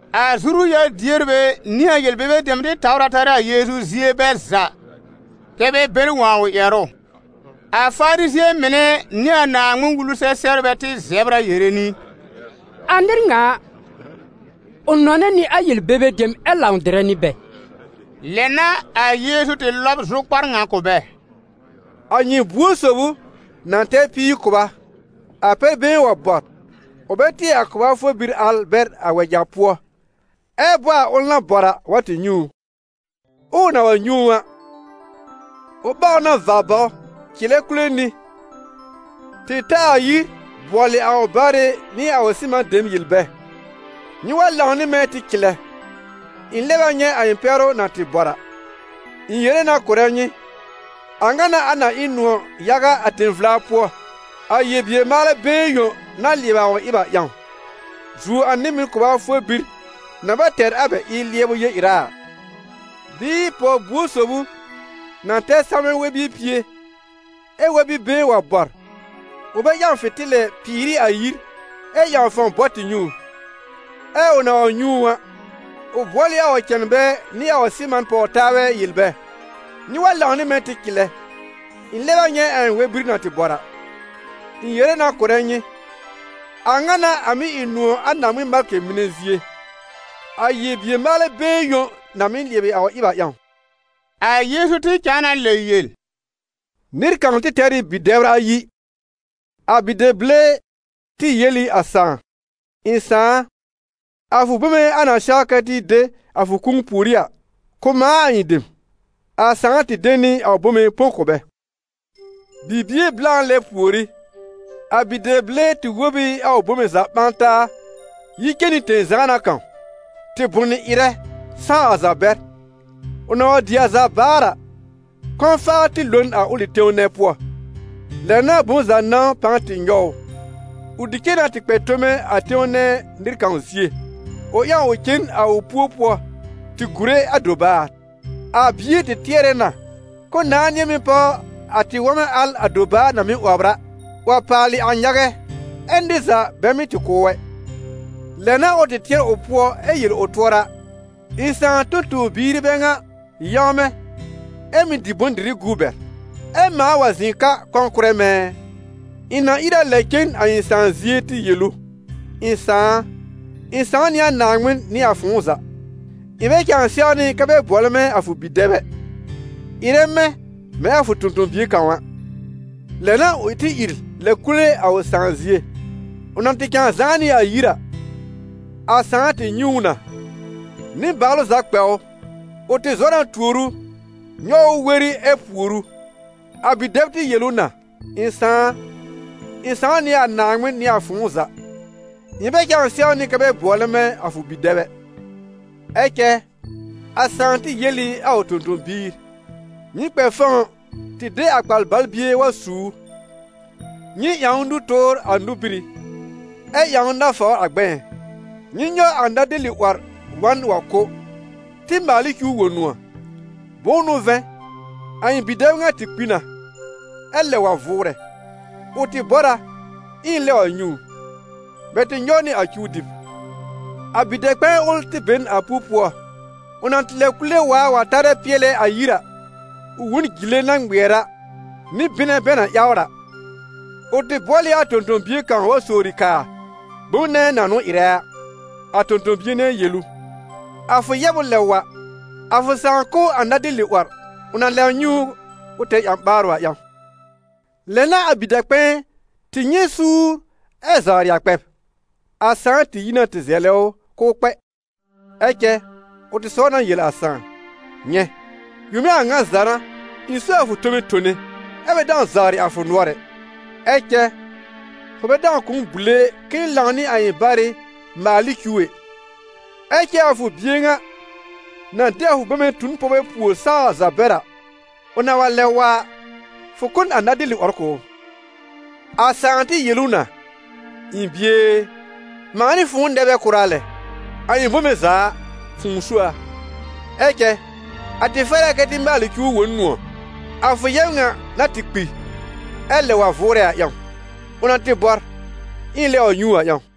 A zuru-yar-dierbɛ nɩ a yel-bebe dem tɩ tawr a tarɛ a Yeezu zie bɛ za, kɛ́ bɛ bɛr wõ a ʋ ƴɛrʋ. A Farizɩ̃ɛ mɩnɛ nɩ a Naaŋmɩn-Wulu-sɛ-sɛbrbɛ tɩ zɛbr a yere nɩ: «A nɩr ŋa a, ʋ nɔnɛ nɩ a yel-bebe dem ɛ lãw dɩrɛ nɩ bɛ!» Lɛ n'a a Yeezu tɩ lɔb zʋkpar ŋa kʋ̀ bɛ: «A nyɩ buor sob ʋ na tɛr píir kʋba, a pɛr-been wa bɔr, ʋ bɛ tɩɛ a kʋba for bir al bɛr a wɛja pʋɔ, ɛ bɔ a ʋl na bɔr a, wa tɩ nyɛ̃ ʋ? Ɛ ʋ na wa nyɛ̃ ʋ a, ʋ ɓaw ʋ na va baw cɩlɛ kule nɩ, tɩ ta a yir bʋɔlɩ a ʋ barɩ nɩ a ʋ sɩman dem yel bɛ: ‹Nyɩ wa lãw nɩ mɛ̃ tɩ cɩlɛ, ɩ̃ lɛb a nyɛ̃ a ɩ̃ pɛ́rʋ na tɩ bɔr a.› Ɩ̃ yere na kʋ̀rɛ nyɩ, a ŋa n'a a na ɩ nʋ̃ɔ̀ yaga a tẽ-vla pʋɔ, a yel-bier-maalɛ been yõ na lɩɛbɩ a ʋ ɩb a ƴãw, zuo a nɩ-mɩn kʋba for bir na bɛ tɛr a bɛ ɩb lɩɛbʋ yel-ɩra a.» «Bɩɩ pɔw buor sob ʋ na tɛr salmɛ̃ wɛr-bie pie, ɛ wɛr-bi-been wa bɔr, ʋ bɛ ƴãw fɩ̃tɩlɛ, pɩɩr ɩ a yir, ɛ ƴãw fãw bɔ tɩ nyɛ̃ ʋ? Ɛ ʋ na wa nyɛ̃ ʋ a, ʋ bʋɔl ɩ a ʋ cɛnbɛ nɩ a ʋ sɩman pɔw taabɛ yel bɛ: ‹Nyɩ wa lãw nɩ mɛ̃ tɩ cɩlɛ, ɩ̃ lɛb a nyɛ̃ a ɩ̃ wɛr-bir na tɩ bɔr a.› Ɩ̃ yere na kʋ̀rɛ nyɩ, a ŋa n'a a mɩ́ ɩ nʋ̃ɔ̀ a Naaŋmɩn malkɩ mɩnɛ zie, a yel-bier-maalɛ been yõ na mɩ́ lɩɛbɩ a ʋ ɩb a ƴãw.» A Yeezu tɩ cãa na lɛ yel: «Nɩr kãw tɩ tɛr ɩ bi-dɛbr ayi. A bi-dɛb-bile tɩ yel ɩ a sãà: ‹Ɩ̃ sãà a, a fʋ bome a na sɛw kɛ tɩ de a fʋ kũu pùorí a, kʋ̀ mãa a ɩ̃ dem.› A sãà tɩ de nɩ a ʋ bome põ kʋ̀ bɛ. Bibie blã lɛ pùorí, a bi-dɛb-bile tɩ wob ɩ a ʋ bome za ɓã taa yi cen nɩ tẽ-zãana kãw, tɩ bʋnɩ ɩrɛ, sãw a za bɛr. Ʋ na wa dɩ a za baar a, kɔ̃-faa tɩ lo n a ʋlɩ tẽw nɛ pʋɔ, lɛ n'a bom za nãw pãa tɩ nyɔw ʋ. Ʋ tɩ cen na tɩ kpɛ tome a tẽw nɛ nɩr kãw zie, ʋ ƴãw ʋ cen a ʋ pu-pʋɔ tɩ gùre a dobaar. A bie tɩ tɩɛrɛ na k'ʋʋ nãá nɩ̃ɛ mɩ́ páw a tɩ-wɔmɛ̃ al a dobaar na mɩ́ 'wɔbr a, 'wɔb paal a nyagɛ, ɛ nɩr za bɛ mɩ́ tɩ kʋ̀ ʋ ɛ. Lɛ n'a ʋ tɩ tɩɛr ʋ pʋɔ ɛ yel ʋ tʋɔra: ‹Ɩ̃ sãà tõ-tõ-biir ɩ bɛ ŋa yãwmɛ̃, ɛ mɩ́ dɩ bʋ̃-dɩrɩ guu bɛr, ɛ mãa wa zɩ̃ ka kɔ̃ kʋ̀rɛ mɛ̃ ɛ! Ɩ̃ na ìr a lɛb cen a ɩ̃ sãà zie tɩ yel ʋ: ɩ̃ sãà a, ɩ̃ sãw nɩ a Naaŋmɩn nɩ a fʋ̃ʋ za. Ɩ̃ bɛ cãa sɛwnɩ kɛ́ bɛ bʋɔlɛ mɛ̃ a fʋ bi-dɛb ɛ. Ɩrɛ mɛ̃, mɛ̃ a fʋ tõ-tõ-bie kãw a.› Lɛ n'a ʋ tɩ ìr lɛb kule a ʋ sãà zie.» «Ʋ na tɩ cãa zãá nɩ a yir a, a sãà tɩ nyɛ̃ ʋ na, nɩbaalʋ za kpɛ ʋ; ʋ tɩ zɔ na tuor ʋ, nyɔw ʋ weri ɛ pùor ʋ. A bi-dɛb tɩ yel ʋ na: ‹Ɩ̃ sãà a, ɩ̃ sãw nɩ a Naaŋmɩn nɩ a fʋ̃ʋ za. Ɩ̃ bɛ cãa sɛwnɩ kɛ́ bɛ bʋɔlɛ mɛ̃ a fʋ bi-dɛb ɛ...› Ɛ cɛ a sãà tɩ yel ɩ a ʋ tõ-tõ-biir: ‹Nyɩ kpɛ fɔ̃w tɩ de a kpar-bal-bie wa su ʋ; nyɩ ƴãw ʋ nũ-tʋʋr a nóbírí, ɛ ƴãw ʋ nafawr a gbɛ̃ɛ́. Nyɩ nyɔw a nadeli-'wɔr wa n wa kʋ́, tɩ maal ɩ cuw wõ nʋ̃ɔ̀, bʋ̃ʋ n'ʋ vɛ̃, a ɩ̃ bi-dɛb ŋa tɩ kpi na, ɛ lɛb wa vʋʋrɛ, ʋ tɩ bɔr a, ɛ ɩ̃ lɛb wa nyɛ̃ ʋ.› Bɛ tɩ nyɔw nɩ a cuw dɩb.» «A bi-dɛ-kpɛ̃ɛ ʋl tɩ be n a pu-pʋɔ. Ʋ na tɩ lɛb kule waar wa tarɛ pɩɛlɛ a yir a, ʋ wõ n jile na ŋmɩɛr a, nɩ bɩnɛ bɛ na ƴawr a. Ʋ tɩ bʋɔl ɩ a tõ-tõ-bie kãw wa sowri kaa bom nɛ na n'ʋ ɩrɛ a. A tõ-tõ-bie nɛ yel ʋ: ‹A fʋ yɛb ʋ lɛb wa, a fʋ sãà kʋ́ a nadeli- 'wɔr, ʋ na lɛb nyɛ̃ ʋ k'ʋ tɛr ƴã-ɓaarʋ a ƴãw.› Lɛ n'a a bi-dɛ-kpɛ̃ɛ tɩ nyɛ̃ suur ɛ zawrɩ a kpɛb. A sãà tɩ yi na tɩ zɛlɛ ʋ k'ʋʋ kpɛ. Ɛ cɛ ʋ tɩ sɔw na yel a sãà: ‹Nyɛ̃, yome a ŋa za n'a ɩ̃ so a fʋ tome tone ɛ bɛ dãw zawrɩ a fʋ nʋɔr ɛ; ɛ cɛ fʋ bɛ dãw kʋ̀ m bùle k'ɩ̃ɩ lãw nɩ a ɩ̃ barɩ maal ɩ cuw ɛ. Ɛ cɛ a fʋ bie ŋa, na de a fʋ bome tu n pɔwbɛ puòr sãw a za bɛr a, ʋ na wa lɛb wa a, fʋ kʋ́ n a nadeli-'wɔr kʋ̀ ʋ!› A sãà tɩ yel ʋ na: ‹Ɩ̃ bie e, mãa nɩ fʋ̃ʋ nɛ bɛ kʋra lɛ, a ɩ̃ bome za a, fʋ̃ʋ so a. Ɛ cɛ a tɩ fɛr a kɛ tɩ maalɩ cuw wõ n nʋ̃ɔ̀, a fʋ yɛb ŋa na tɩ kpi ɛ lɛb wa vʋʋrɛ a ƴãw, ʋ na tɩ bɔr ɛ ɩ̃ lɛb wa nyɛ̃ ʋ a ƴãw.›»